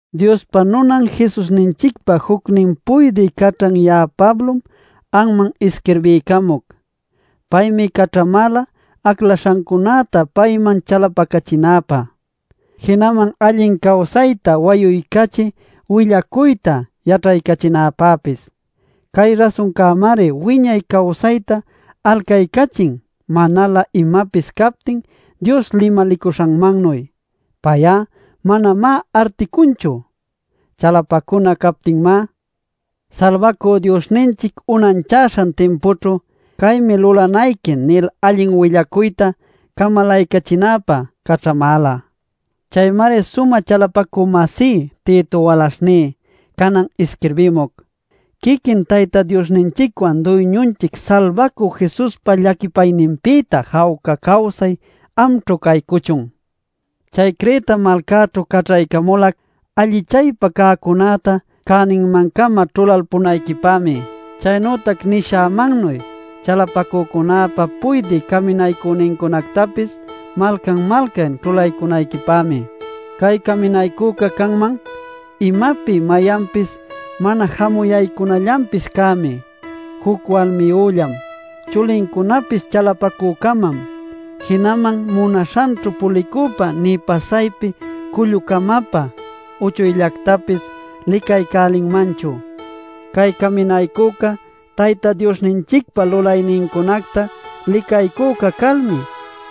Diospa nunan Jesusninchicpa jucnin puydï caćhan ya'a Pablom anman isquirbiycamuc. Paymi caćhamäla aclaśhancunäta payman chalapacachinäpä, jinaman allin cawsayta wayuycachï willacuyta yaćhaycachinäpäpis. Cay rasuncämari wiñay cawsayta alcaycachin manalä imapis captin Dios limalicuśhanmannuy. Pay'a manamá articunchu. Chalapacuna captïmá, Salbacü Diosninchic unanchaśhan timpućhu “Caymi lulanayqui” nil allin willacuyta camalaycachinäpä caćhamäla. Chaymari sumä chalapacü-masí Tito walaśhní canan isquirbimuc. Quiquin Tayta Diosninchicwan Duyñunchic Salbacü Jesuspa llaquipayninpïta jawca cawsay amćhu caycuchun. Chay Creta malcaćhu caćhaycamulac allichaypä cäcunäta cäninman-cama ćhulalpunayquipämi, chaynütac nishämannuy chalapacücunäpä puydï caminaycünincunactapis malcan-malcan ćhulaycunayquipämi. Cay caminaycüca canman: imapi mayanpis mana jamuyaycunallanpis cämi, juc walmiyüllam, chulincunapis chalapacü-camam, jinaman munaśhanćhu pulicüpä nï pasaypi cullu-camapä uchuyllactapis licaycälinmanchu. Cay caminaycüca Tayta Diosninchicpa lulaynincunacta licaycüca calmi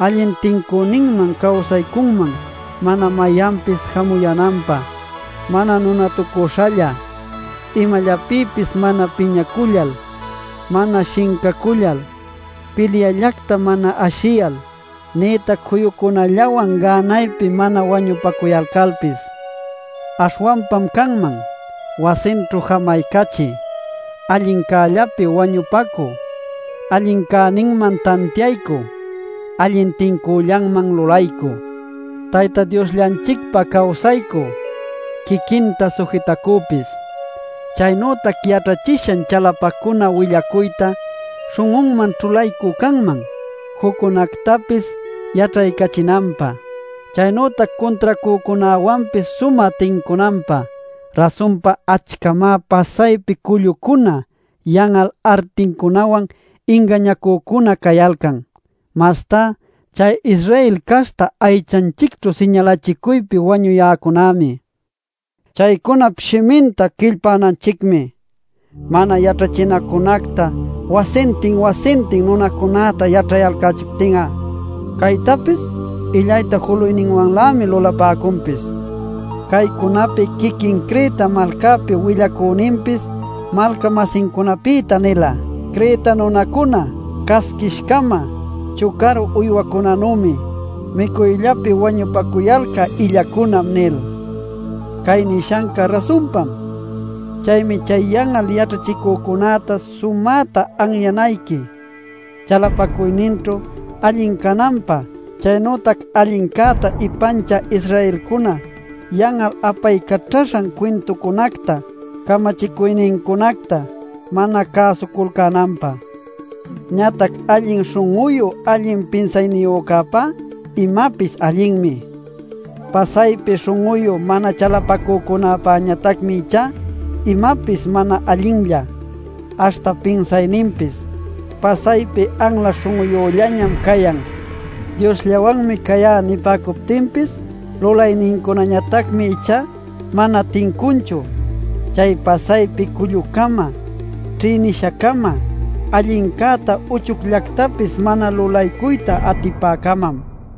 allin tincüninman cawsaycunman mana mayanpis jamuyänanpä: mana nunatucüśhalla, imallapïpis mana piñacullal, mana shincacullal, pilyallacta mana ashiyal, nïtac juyucunallawan gänaypi mana wañupacuyalcalpis. Aśhwanpam canman: wasinćhu jamaycachï, allincällapi wañupacü, allin cäninman tantiaycü, allin tincüllanman lulaycü, Tayta Diosllanchicpä cawsaycü, quiquinta sujitacüpis. Chaynütac yaćhachishan chalapacuna willacuyta śhun'unman ćhulaycü canman, juccunactapis yaćhaycachinanpä, chaynütac cuntracücunäwanpis sumä tincunanpä. Rasunpa, achcamá pasaypi cullucuna yan'al articunawan ingañacücuna cayalcan. Mastá chay Israel caśhta aychanchicćhu siñalachicuypi wañuyäcunämi. Chaycunap shiminta quillpänanchicmi, mana yaćhachinacunacta wasintin-wasintin nunacunäta yaćhayalcächiptin'a. Caytapis illayta juluyninwanlämi lulapäcunpis. Caycunapi quiquin Creta malcapi willacüninpis malca-masincunapïta nila: “Creta nunacuna casquish-camam, chucaru uywacunanümi, micuyllapi wañupacuyalcä illacunam” nil. Cay nishanca rasunpam. Chaymi chay yan'al yaćhachicücunäta sumäta anyanayqui, chalapacuyninćhu allin cananpä chaynütac allincäta ipanchä Israelcuna yan'al apaycaćhaśhan cuintuncunacta camachicuynincunacta mana cäsuculcänanpä. Ñatac allin śhun'uyu allin pinsayniyücäpá imapis allinmi. Pasaypi śhun'uyu mana chalapacücunäpäñatacmi ichá imapis mana allinlla, aśhta pinsayninpis, pasaypi anla śhun'uyüllañam cayan. “Diosllawanmi cayá” nipäcuptinpis, lulaynincunañatacmi ichá mana tincunchu. Chay pasaypi cullu-cama, ćhïnisha-cama, allincäta uchuyllactapis mana lulaycuyta atipä-camam.